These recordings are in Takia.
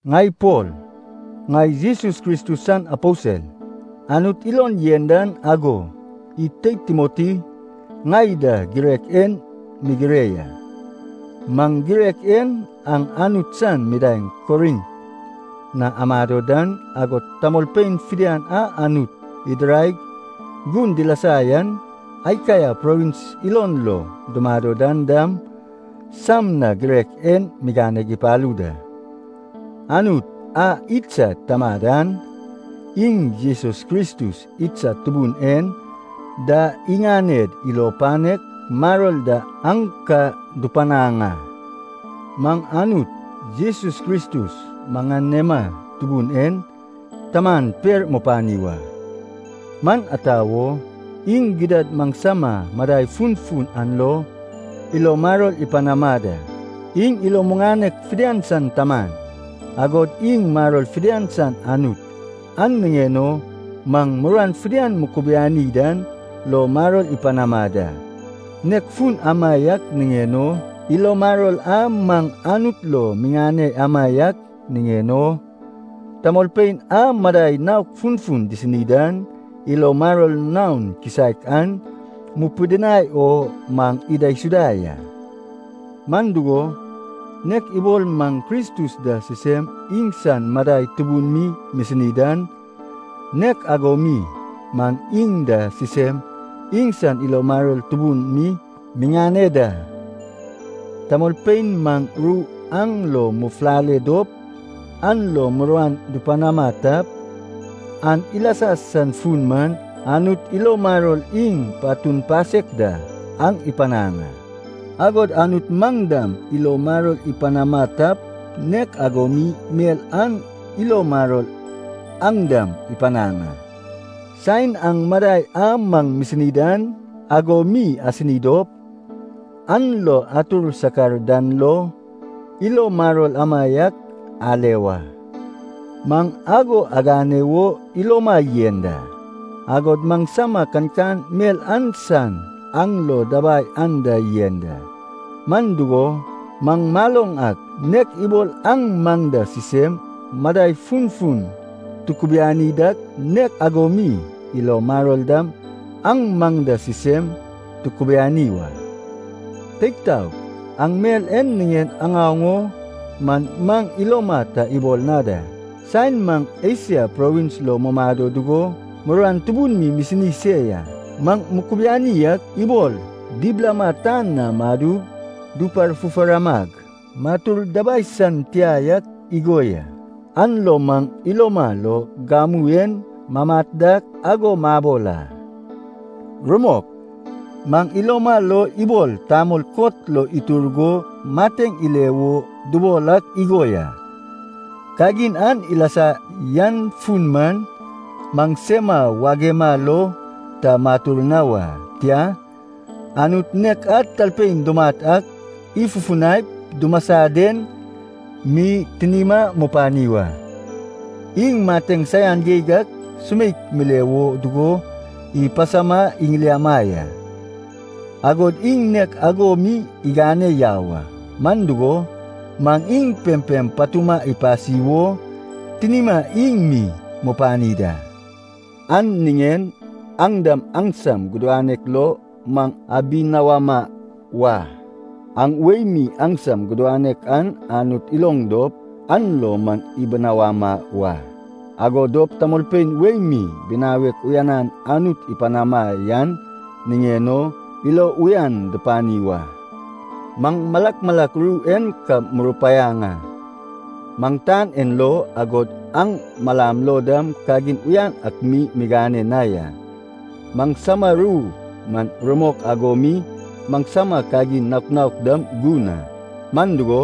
Ŋai Pol, ŋai Jesus Kristus san aposel, Anut ilon yen dan ago, id teid Timoti ŋai da girek en migire ya. Maŋ girek en aŋ Anut san midaeŋ Korint na amado dan, agod tamolpein fidian a Anut idiraig gun dilasa yan Akaia provins ilon lo dumado dan dam, sam na girek en migane ipalu da. Anut a idsad Tamad an, iŋ Jesus Kristus idsad Tubun en da iŋaned ilo panek maror da aŋ ka dupanaŋ a. Maŋ Anut, Jesus Kristus maŋanema Tubun en Taman per mupani wa. Man ata wo, iŋ gidad maŋsama madai funfun an lo ilo maror ipanama da. Iŋ ilo muŋanek fidian san Taman, agod iŋ maror fidian san Anut, an niŋen o maŋ muruan fidian mukubiani dan lo maror ipanama da. Nek fun amaiak niŋen o ilo maror a maŋ Anut lo miŋane amaiak niŋen o, tamolpein a madai naok funfun disini dan ilo maror naon kisaek an mupidinai o maŋ idaisuda ya. Man dugo, nek ibol maŋ Kristus da sisem iŋsan madai tubun mi misini dan, nek ago mi maŋ iŋ da sisem iŋsan ilo maror tubun mi miŋane da. Tamolpein maŋ ru aŋ lo mufulale dop an lo muruan dupanama tap, an ilasa san fun man, Anut ilo maror iŋ patun pasek da aŋ ipanaŋ a. Agod Anut maŋ dam ilo maror ipanama tap, nek ago mi mel an ilo maror aŋ dam ipanaŋ a. Saen aŋ madai a maŋ misini dan ago mi asini dop an lo atur sakar dan lo, ilo maror amaiak ale wa. Maŋ ago agane wo iloma yen da, agod maŋsama kankan mel an san aŋ lo dabai anda yen da. Man dugo, maŋ maloŋ ak nek ibol aŋ maŋ da sisem madai funfun tukubiani dak, nek ago mi ilo maror dam aŋ maŋ da sisem tukubiani wa. Teig taog, aŋ mel en niŋen aŋaoŋ o man maŋ iloma ta ibol na da. Saen maŋ Esia provins lo mumado dugo muruan tubun mi misini se ya. Maŋ mukubiani ak ibol dibilama tan na madug duparfufaramag matur dabai san tia yak igo ya. An lo maŋ iloma lo gamu en mamat dak ago mabol a. Rumok, maŋ iloma lo ibol tamol kot lo itur go mateŋ ile wo dubol ak igo ya. Kagin an ilasa yan fun man, maŋsema wagema lo ta matur na wa, tia, Anut nek a talpein dumat ak ifufunaip dumasa den mi tinima mupani wa. Iŋ mateŋ saian geig ak sumeik mile wo dugo ipasama iŋiliama ya, agod iŋ nek ago mi igane yau a. Man dugo, maŋ iŋ pempem patuma ipasi wo tinima iŋ mi mupani da. An niŋen aŋ dam aŋsam gudanek lo maŋ abinawama wa. Aŋ wei mi aŋsam gudanek an Anut iloŋ dop an lo maŋ ibinawama wa. Ago dop tamolpein wei mi binawek uyanan Anut ipanama yan niŋen o ilo uyan dupani wa. Maŋ malak malak ru en ka murupaiaŋ a. Maŋ tan en lo, agod aŋ malam lo dam kagin uyan ak mi migane na ya. Maŋsama ru man rumok ago mi maŋsama kagin naok naok dam gun a, man dugo,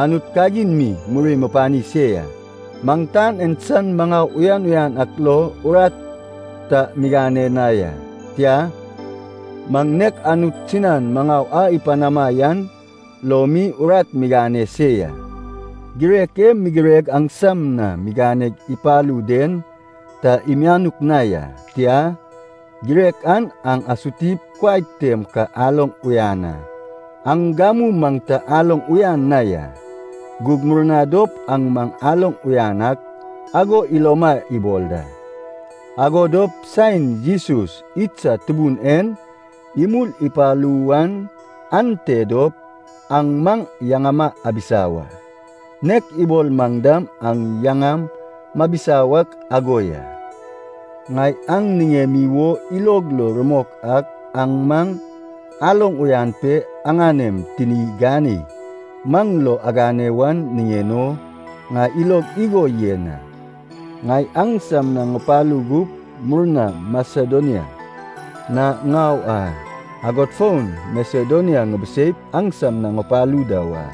Anut kagin mi muri mupani se ya. Maŋ tan en san maŋau uyan uyan ak lo urat ta migane na ya, tia, maŋ nek Anut sinan maŋau a ipanama yan lo mi urat migane se ya. Girek e migireg aŋsam na miganeg ipalu den ta imianuk na ya. Tia, girek an aŋ asutip kuai tem ka aloŋ uyan a. Aŋ gamu maŋ ta aloŋ uyan na ya, gug murna dop aŋ maŋ aloŋ uyan ak ago iloma ibol da. Ago dop saen Jesus idsad Tubun en imul ipalu wan ante dop aŋ maŋ yaŋama abisa wa, nek ibol maŋ dam aŋ yaŋam mabisa wak ago ya. Ŋai aŋ niŋemi wo ilog lo rumok ak aŋ maŋ aloŋ uyan pe aŋanem tini ganei maŋ lo agane wan niŋen o, ŋai ilog igo yen a. Ŋai aŋsam na ŋupalu gup murna Masedonia na ŋau a, agod fon Masedonia ŋibiseip aŋsam na ŋupalu da wa.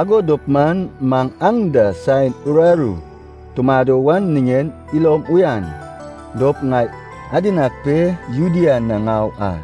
Ago dop man maŋ aŋ da saen uraru tumado wan niŋen ilom uyan dop ŋai adinag pe Judea na ŋau a.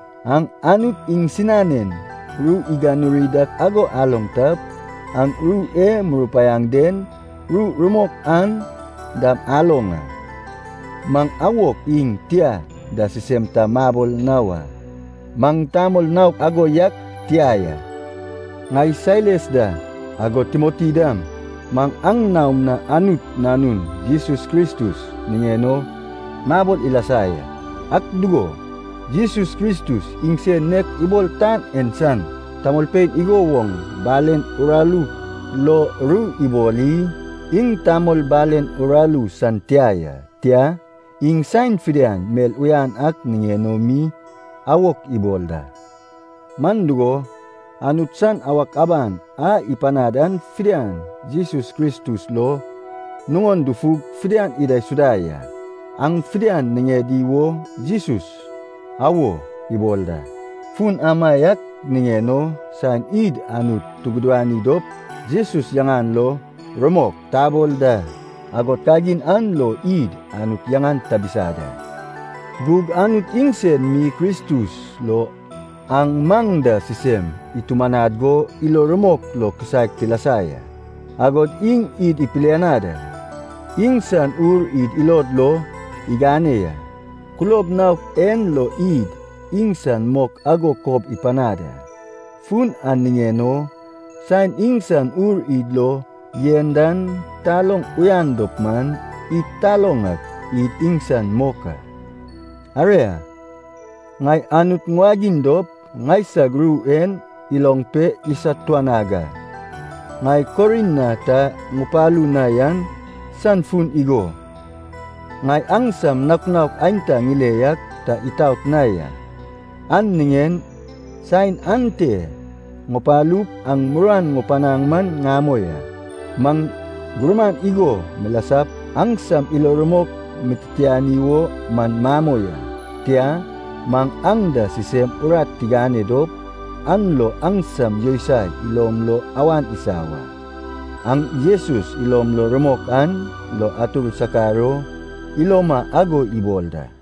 Aŋ Anut iŋsinanen ru iganuri dak ago aloŋ tap, aŋ ru e murupaiaŋ den ru rumok an dam aloŋ a. Maŋ “awok” iŋ “tia” da sisem ta mabol na wa. Maŋ tamol naok ago yak tia ya. Ŋai Sailas da, agod Timoti dam, maŋ aŋ naom na Anut Nanun Jesus Kristus niŋen o mabol ilasa ya. Ak dugo, Jesus Kristus iŋsen nek ibol tan en san tamolpein igo woŋ balen uraru lo ru ibol i? Iŋ tamol balen uraru san tia ya, tia, iŋ saen fidian mel uyan ak niŋen o mi awok ibol da. Man dugo, Anut san awak aban a ipanad an fidian Jesus Kristus lo nuŋon dufug fidian idaisuda ya. An fidian niŋedi wo Jesus “Awo” ibol da. Fun amaiak niŋen o saen id Anut tugudani dop Jesus yaŋan lo “Rumok” tabol da. Agod kagin an lo id Anut yaŋan tabisa da. Gug Anut iŋsen mi Kristus lo aŋ maŋ da sisem itumanad go ilo rumok lo kisaek tilasa ya. Agod iŋ id ipilianad a. Iŋsan Ur id ilod lo igane ya. Kulob naok en lo id iŋsan mok ago kob ipanad a. Fun an niŋen o saen iŋsan Ur id lo yen dan taloŋ uyan dop man, id taloŋ ak id iŋsan mok a. Aria, ŋai Anut ŋuwagiŋ dop ŋaisag ru en iloŋ pe isatuanag a. Ŋai Korint na ta ŋupalu na yan san fun igo. Ŋai aŋsam naok naok aenta ŋile yak ta itaot na ya, an niŋen saen ante ŋupalup aŋ muruan ŋupanaŋ man ŋamoi a. Maŋ gurman igo milasap aŋsam ilo rumok mititiani wo man mamoi a. Tia, maŋ aŋ da sisem urat tigane dop an lo aŋsam yousai ilom lo awan isa wa. Aŋ Jesus ilom lo rumok an lo atur sakar o iloma ago ibol da.